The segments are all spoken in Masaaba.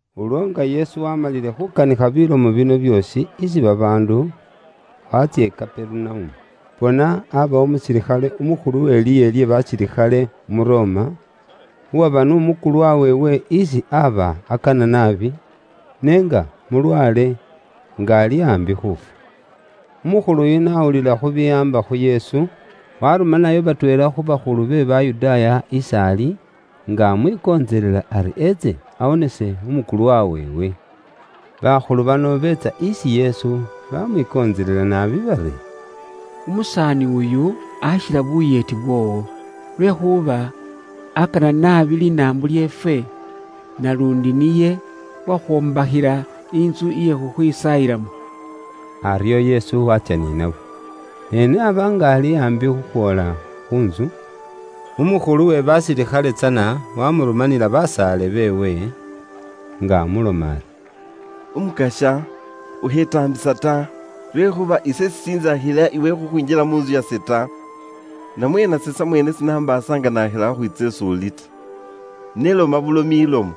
Ulwo nga Yesu waamalile khukanikha bilomo bino byoosi isi babaandu, waatsya i Kaperunaumu. Bona, abawo umusilikhale umukhulu we liihe lye basilikhale umu Roma, uwaba n'umukulwa weewe isi aba akana naabi, ne nga mulwaale, nga ali aambi khuufwa. Umukhulu yuno n'awulila bibiwaamba khu Yesu, warumanayo batweela khu bakhulu be Bayudaaya is'ali, nga amwikontselela ari etse awonese umukulwa weewe. Bakhulu bano biitsa isi Yesu, bamwikontselela naabi bari, “Umusaani uyu akhila buyeeti bwoowo. Lwekhuuba akana naabi linaambo lyeefwe, naluundi niye uwakhwombakhila intsu iye khukhwisaayilamo.” Aryo Yesu waatsya ni nabo. Ne n'aba nga ali aambi khukhwoola khu ntsu, umukhulu we basilikhale tsana wamurumanila basaale beewe, nga amuloma ari, “Umukasya ukhetaambisa ta, lwekhuuba ise sishintsakhila iwe khukhwinjila mu ntsu yase ta; namwe nase samweene sinambaasa nga nakhila khukhwiitsa is'uli ta. Ne loma bulomi ilomo,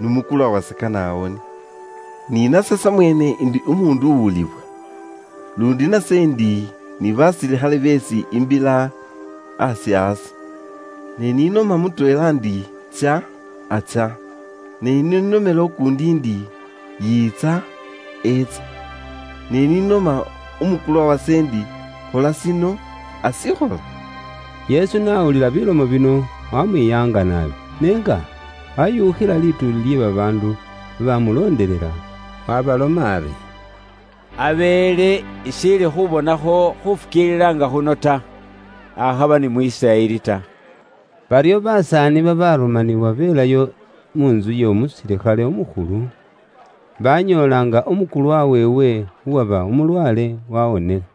n'umukulwa wase kane awone. Ni nase samweene ndi umuundu uwulibwa, luundi nase ndi ni basilikhale beesi imbila aasi aase. Ne ni noma mutweela ndi, ‘Tsya,’ atsya. Ne ni nomela ukuundi ndi, ‘Yiitsa,’ etsa. Ni noma umukulwa wase ndi, ‘Khola shino,’ ashikhola.” Yesu n'awulila bilomo bino, wamwiyaanga naabi, ne nga washukhiile lituuli lye babaandu babamuloondelela, waabaloma ari, “Abeele ishiili khubonakho khufukiilila nga khuno ta, akhaba ni mu Isiraeli ta!” Baryo basaani babarumaniwa belayo mu ntsu y'omusilikhale umukhulu, banyoola nga umukulwa weewe uwaba umulwaale wawonile.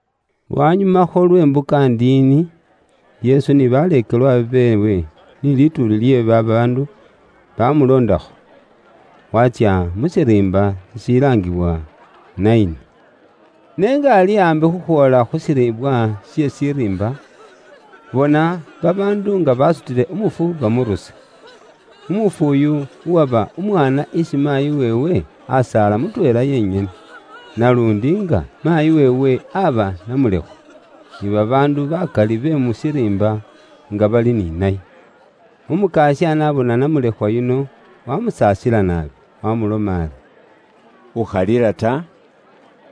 Lwanyumakho lwe mbuka ndiini, Yesu ni baleekelwa beewe ni lituuli lye babaandu bamuloondakho, waatsya mu shiriimba shishilaangibwa Naini. Ne nga ali aambi khukhwoola khu shilibwa she shiriimba, bona, babaandu nga basutile umufu bamurusa; umufu uyu uwaba umwaana isi maayi weewe asaala mutweela yenyene, naluundi nga maayi weewe aba namulekhwa. Ni babaandu bakali be mu shiriimba nga bali ni naye. Umukasya n'abona namulekhwa yuno, wamusaasila naabi, wamuloma ari, “Ukhalila ta.”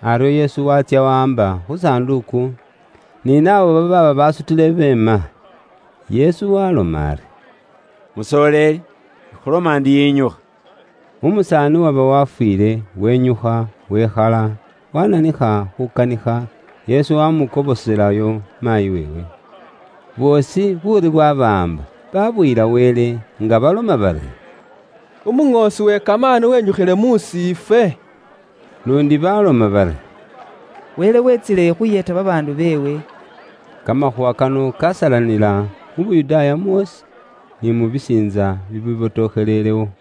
Aryo Yesu waatsya wawaamba khu sanduuku, ni naabo babaaba basutile beema. Yesu waaloma ari, “Musoleeli, ikhuloma ndi yinyukha!” Umusaani uwaba wafwiile, wenyukha wekhala, wananikha khukanikha, Yesu wamukoboselayo maayi weewe. Boosi buuri bwabawaamba, babuyila Wele, nga baloma bari, “Umuŋoosi we kamaani wenyukhiile musiifwe!” Luundi baloma bari, “Wele wetsile khuyeeta babaandu beewe.” Kamakhuuwa kano kasalanila mu Yuda mwoosi, ni mu bisiintsa bibibotokhelelewo.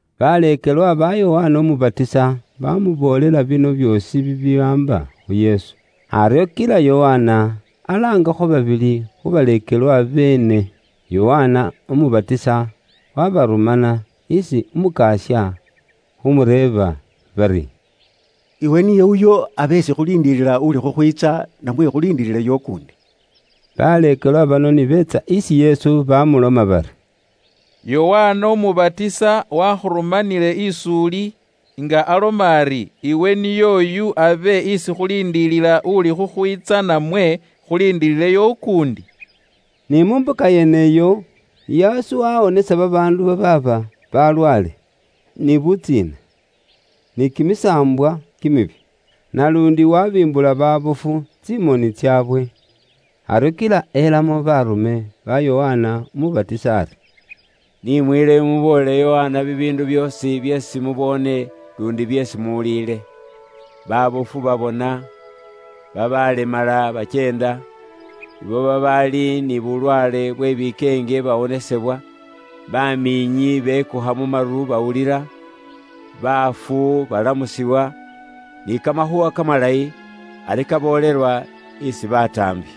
Baleekelwa ba Yokana Umubatisa, bamuboolela bino byoosi bibiwaamba khu Yesu. Aryo kila Yokana alaangakho babili khu baleekelwa beene. Yokana Umubatisa wabarumana isi Umukasya, khumureeba bari, “Iwe niye uyo abe isi khuliindilila uli khukhwiitsa, namwe khuliindilileyo ukuundi?” Baleekelwa bano ni beetsa isi Yesu, bamuloma bari, “Yokana Umubatisa wakhurumanile is'uli, nga aloma ari, ‘Iwe niy'oyu abe isi khuliindilila uli khukhwiitsa namwe khuliindilileyo ukuundi?’” Ni mu mbuka nyeneyo, Yesu waawonesa babaandu babaaba balwaale, ni butsiina, ni kimisaambwa kimibi, naluundi waabimbula baabofu tsimoni tsaabwe. Aryo kila elamo baarume ba Yokana Umubatisa ari, “Ni mwiileyo muboolele Yokana bibiindu byoosi byeesi muboone luundi byeesi muwuliile: baabofu babona, babaalemala bakyeenda, abo babaali ni bulwaale bwe bikeenge bawonesebwa, bamiinyi bekukha mu maru bawulila, baafu balamusibwa, ni Kamakhuuwa Kamalayi ari kaboolelwa isi bataambi.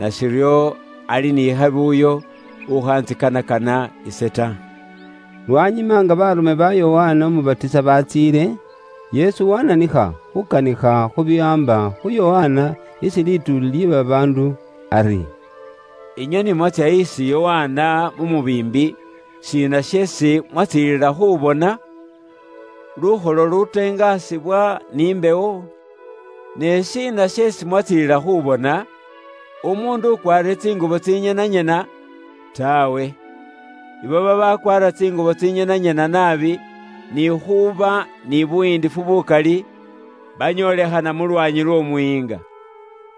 Nashiryo ali ni khabi uyo ukhantsikanakana ise ta.” Lwanyuma nga baarume ba Yokana Umubatisa baatsiile, Yesu waananikha khuukanikha khu biwaamba khu Yokana isi lituuli lye babaandu ari, “Inywe ni mwatsya isi Yokana mu mubiimbi, shiina sheesi mwatsiililila khuubona? Lukholo luluuteengasibwa ni mbewo? Ne shiina sheesi mwatsiililila khuubona? Umuundu ukwaarire tsingubo tsinyenanyena? Taawe! abo babakwaara tsingubo tsinyenanyena naabi ni khuuba ni buyiindifu bukali, banyoolekhana muungo mw'omuyiinga.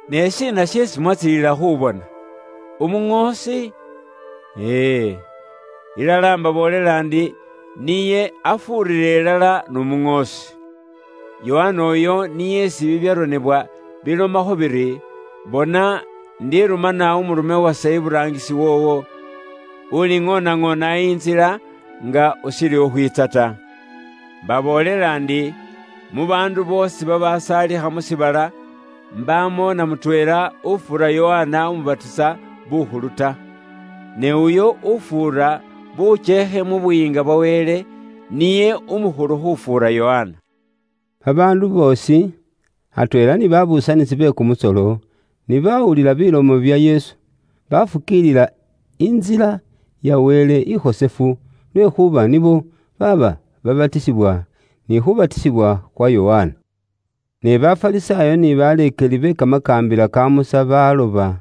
Ne shiina sheesi mwatsiililila khuubona? Umuŋoosi? E e, ilala mbaboolela ndi niye afuurira ilala n'umuŋoosi. Yokana oyu niye isi bibyaronebwa bilomakho biri, ‘Bona, indirumana umurume wase iburaangisi woowo, uliŋoonaŋoona intsila nga ushiili khukhwiitsa ta.’ Mbaboolela ndi, mu baandu boosi babasaalikha mu shiibala, mbaamo na mutweela ufuura Yokana Umubatisa bukhulu ta. Ne uyo ufuura bukyeekhe mu Buyiinga bwa Wele, niye umukhulu khufuura Yokana.” Babaandu boosi, atweela ni babuusanisi be kumusolo, ni bawulila bilomo bya Yesu, bafukiilila intsila ya Wele ikhosefu lwekhuuba nibo baaba babatisibwa ni khubatisibwa khwa Yokana. Ne Bafarisaayo ni baleekeli be kamakaambila ka Musa baloba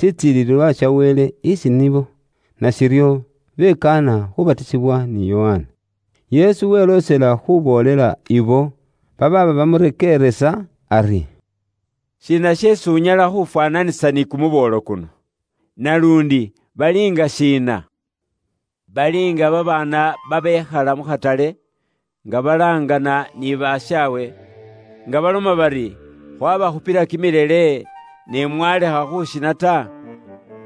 shitsilililwa sha Wele isi nibo, nashiryo bekaana khubatisibwa ni Yokana. Yesu weloosela khuuboolela abo babaaba bamurekeeresa ari, “Shiina sheesi unyala khuufwaananisa ni kumuboolo kuno? Naluundi baliinga shiina? Bali nga babaana babekhala mu khatale, nga balaangana ni bashaawe, nga baloma bari, ‘Khwabakhupila kimilele, ne mwalekha khushina ta,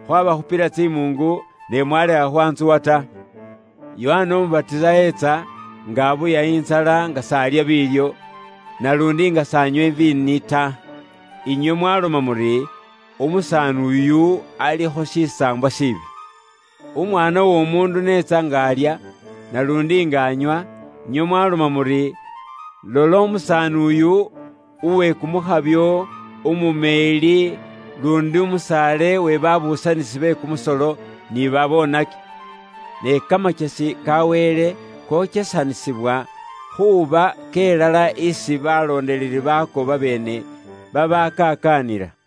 khwabakhupila tsimuungu, ne mwalekha khwantsuwa ta.’ Yokana Umubatisa etsa, nga abuya intsala nga s'alya biilyo, naluundi nga s'anywa iviini ta, inywe mwaloma muri, ‘Umusaani uyu, alikho shisaambwa shiibi.’ Umwaana w'Omuundu n'etsa nga alya, naluundi nga anywa, inywe mwaloma muri, ‘Lola umusaani uyu uwe kumukhabyo, umumeeli, luundi musaale we babuusanisi be kumusolo, ni babonaki.’ Ne kamakyesi ka Wele kokyesanisibwa khuuba kelala isi baloondeleli baako babeene babakakaanila.”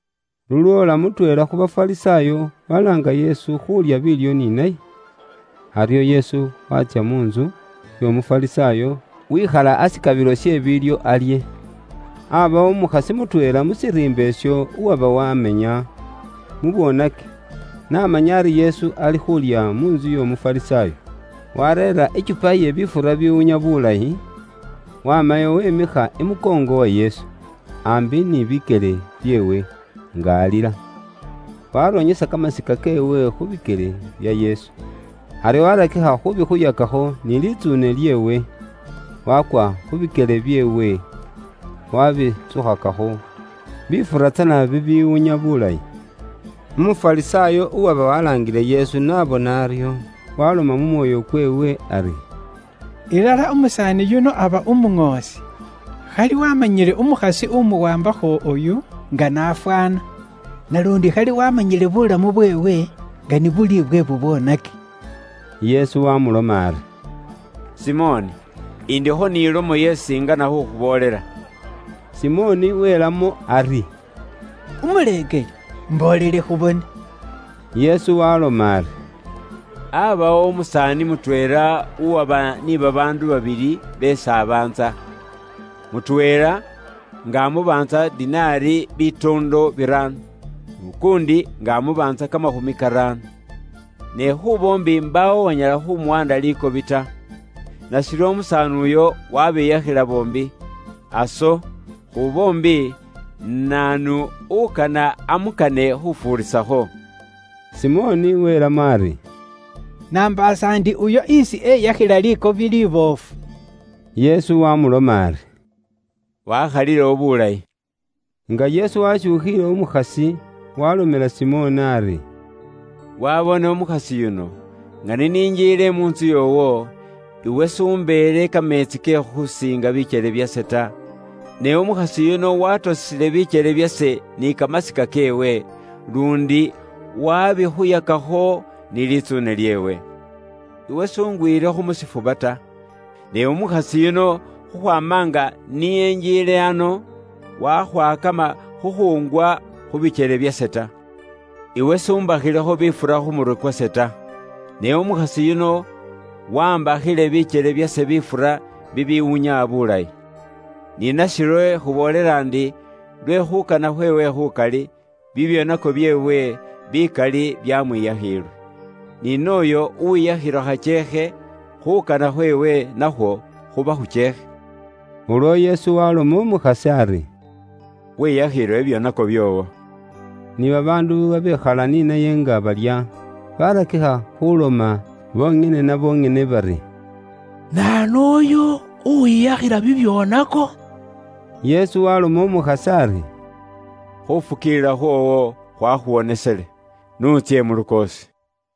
Lulwoola mutweela khu Bafarisaayo waloomba Yesu khuulya biilyo ni naye. Aryo Yesu waatsya mu ntsu y'Omufarisaayo wikhala ashikabilo she biilyo alye. Aabawo umukhasi mutweela mu shiriimba isho uwaba waamenya mu bwoonaki, n'amanya ari Yesu alikhuulya mu ntsu y'Omufarisaayo, waareera i kyupa iye bifura bibiwunya bulayi, waamayo wiimikha imukoongo wa Yesu, aambi ni bikyele byeewe, nga alila. Waaronyesa kamasika keewe khu bikyele bya Yesu. Aryo waarakikha khuubikhuyakakho ni litsuune lyeewe, waakwa khu bikyele byeewe, waabihakhakho bifura tsana bibiwunya bulayi. Umufarisaayo uwaba walaangile Yesu n'abona aryo, waaloma mu mwoyo kweewe ari, “Ilala umusaani yuno aba Umuŋoosi, khali waamanyile umukhasi umuwaambakho oyu nga n'afwaana, naluundi khali waamanyile buulamu bweewe nga ni buli bwe bubwoonaki.” Yesu waamuloma ari, “Simoni, indikho ni lomo isi ingana khukhuboolela.” Simoni welamo ari, “Umuleekeli, imboolele khubone.” Yesu waaloma ari, “Aabawo umusaani mutweela uwaba ni babaandu babili beesi abaantsa. Mutweela nga amubaantsa dinari bitoondo biraano, n'ukuundi nga amubaantsa kamakhumi karaano. Ne khu boombi mbaawo uwanyala khumuwaanda likobi ta. Nashiryo umusaani uyo waabiyakhila boombi. Aso, khu boombi, naanu ukana amukane khufuurisakho?” Simoni welamo ari, “Nambaasa ndi uyo isi eyakhila likobi liboofu.” Yesu waamuloma ari, “Waakhalilewo buulayi.” Nga Yesu waashukhiile umukhasi, waalomela Simoni ari, “Waaboone umukhasi yuno? Nga ni ninjiile mu ntsu yoowo, iwe s'umbeele kameetsi ke khusiinga bikyele byase ta, ne umukhasi yuno waatosile bikyele byase ni kamasika keewe, luundi waabikhuyakakho ni litsuune lyeewe. Iwe s'ungwilekho mu shifuba ta, ne umukhasi yuno khukhwaama nga ni enjiile ano, wakhwakama khukhuungwa khu bikyele byase ta. Iwe s'umbakhilekho bifura khu murwe kwase ta, ne umukhasi yuno waambakhile bikyele byase bifura bibiwunya bulayi. Ni nashiryo ikhuboolela ndi, lwe khuukana khweewe khukali, bibyoonako byeewe bikali byamwiyakhiilwe. Ni nooyo uwiyakhilwa khakyeekhe, khuukana khweewe nakhwo khuba khukyeekhe.” Ulwo Yesu waloma umukhasi ari, “Weyakhiilwe bibyoonako byoowo.” Ni babaandu babekhala ni naye nga balya barakikha khuloma bonyene na bonyene bari, “Naanu uyu, uwiyakhila bibyoonako?” Yesu waloma umukhasi ari, “Khufukiilila khwoowo khwakhuwonesele, n'utsye mu lukoosi.”